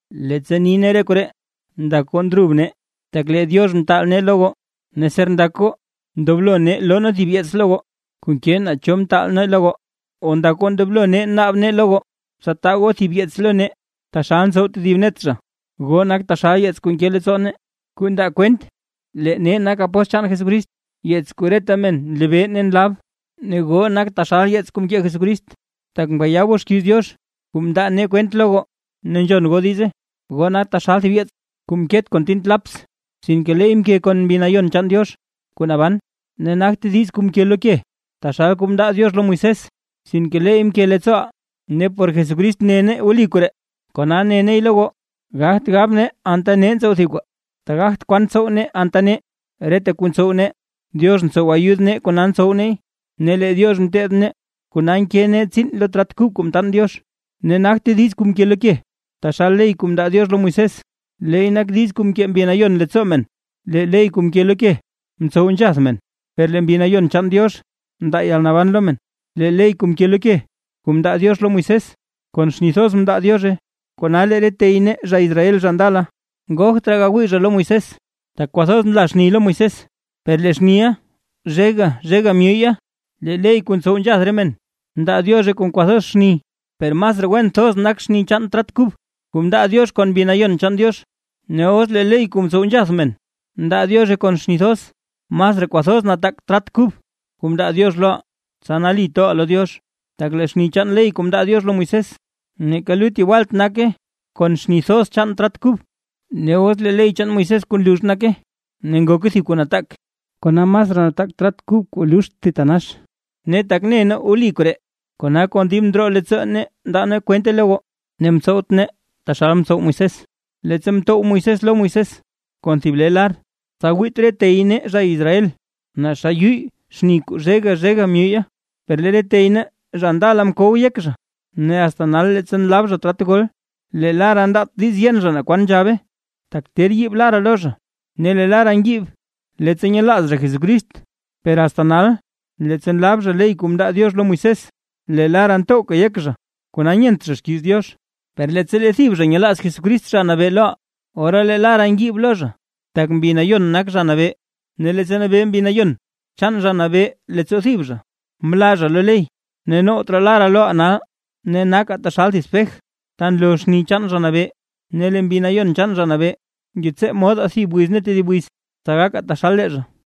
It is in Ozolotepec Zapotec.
Leettsa ni nee re koree, ndak goo ndrub nee, tak lee Diox mtaal nee lo goo. Ne ser ndak goo ndoblo nee loo nee thib yeets goo, kuu nke naa cho mtaal nee lo goo, o ndak goo ndoblo naab nee lo goo, tsa taa goo thib yeets lo nee, taxal ntsow tedib net zha. Goo nak taxal yeets kuu nke leettsoo nee kuu ndaa kwent, lee nee nak apóstl chaan Jesucrist; yeets kuu reta men nlebee ne nlab. Ne goo nak taxal yeets kuu mkee Jesucrist, tak mkayaa goo xkiiz Diox kuu mndaa nee kwent lo goo ne nzhon goo diize. Goo nak taxal thib yeets kuu mket kon tint laps, sinke leey mke kon Mbi Nayon chaan Diox kuu naban; ne nagte diiz kuu mke lo ke, taxal kuu mndaa Diox lo Moisés, sinke leey mke leettsooʼaa. Ne por Jesucrist ne nee wli koree, kona ne neey lo goo. Gagt gab nee anta nee ntsow thib kwaa, tak gagt kwan tsow nee anta nee; reta kuu ntsow nee, Diox ntsow ayud nee kona ntsow neey. Ne lee Diox mteteed nee, kona nke nee tsiin lo trat kub kuu mtaan Diox. Ne nagte diiz kuu mke lo ke, taxal ley kuu mndaa Diox lo Moisés; leey nak diiz kuu mkee Mbi Nayon leen leettsoo men. Lee ley kuu mke lo ke ntsow nzhath men, per lee Mbi Nayon chaan Diox ndaa yalnaban lo men. Lee ley kuu mke lo ke kuu mndaa Diox lo Moisés, kon xni thoz mndaa Diozhe, kona lee re tey nee zha Israel zha ndala, ngogt raa gawii zha lo Moisés, tak kwathoz nla xni lo Moisés, per lee xniʼa zhega zhega myuye. Lee ley kuu ntsow nzhath re men mndaa Diozhe kon kwathoz xni, ¡per masraa wen thoz nak xni chaan trat kub kuu mndaa Diox kon Mbi Nayon chaan Diox! Ne os lee ley kuu mtsow nzhath men mndaa Diozhe kon xni thoz, ¡masraa kwathoz nataak trat kub kuu mndaa Diox loʼaa, tsa nali toʼaa lo Diox! Tak lee xni chaan ley kuu mndaa Diox lo Moisés, neeka lut yewalt naka kon xni thoz chaan trat kub. Os lee ley chaan Moisés kuu nlux nake, ne ngoke thib kuu nataak, kona masraa nataak trat kub kuu luxt thitanax. Ne tak ne nee wli koree, kona kon dib ndroo leettsoo nee ndaa nee kwente lo goo. Ne ntsowt nee taxal mtsow Moisés, leettsa mtow Moisés lo Moisés kon thib le lar, tsa wiit re tey nee zha Israel naa xa yuyy xni kuu zhega zhega myuyya. Per lee re tey nee zha ndala mkow yek zha. Ne asta nal leettsa nlab zha trat gol, lee lara ndaat diiz yen zha naa kwan nzhabe, tak ter yiib lara lo zha; ne lee lara ngiib leettsa nyelaaz zha Jesucrist. Per asta nal, leettsa nlab zha ley kuu mndaa Diox lo Moisés, lee lara ntowka yek zha kona nyent zha xkiiz Diox. Per leettsa lee thib zha nyelaaz Jesucrist Zha Nabee loʼaa, ora lee lara ngiib lo zha. Tak Mbi Nayon nak Zha Nabee; ne leettsa nabee Mbi Nayon chaan Zha Nabee leettsoo thib zha, mlaa zha lo ley. Ne nowt raa lara loʼaa nal, ne nakaa taxal thib spej ta nloo xni chaan Zha Nabee, ne lee Mbi Nayon chaan Zha Nabee, ngetsee modaa thib wiz ne tedib wiz, tsa gakaa taxal lee zha.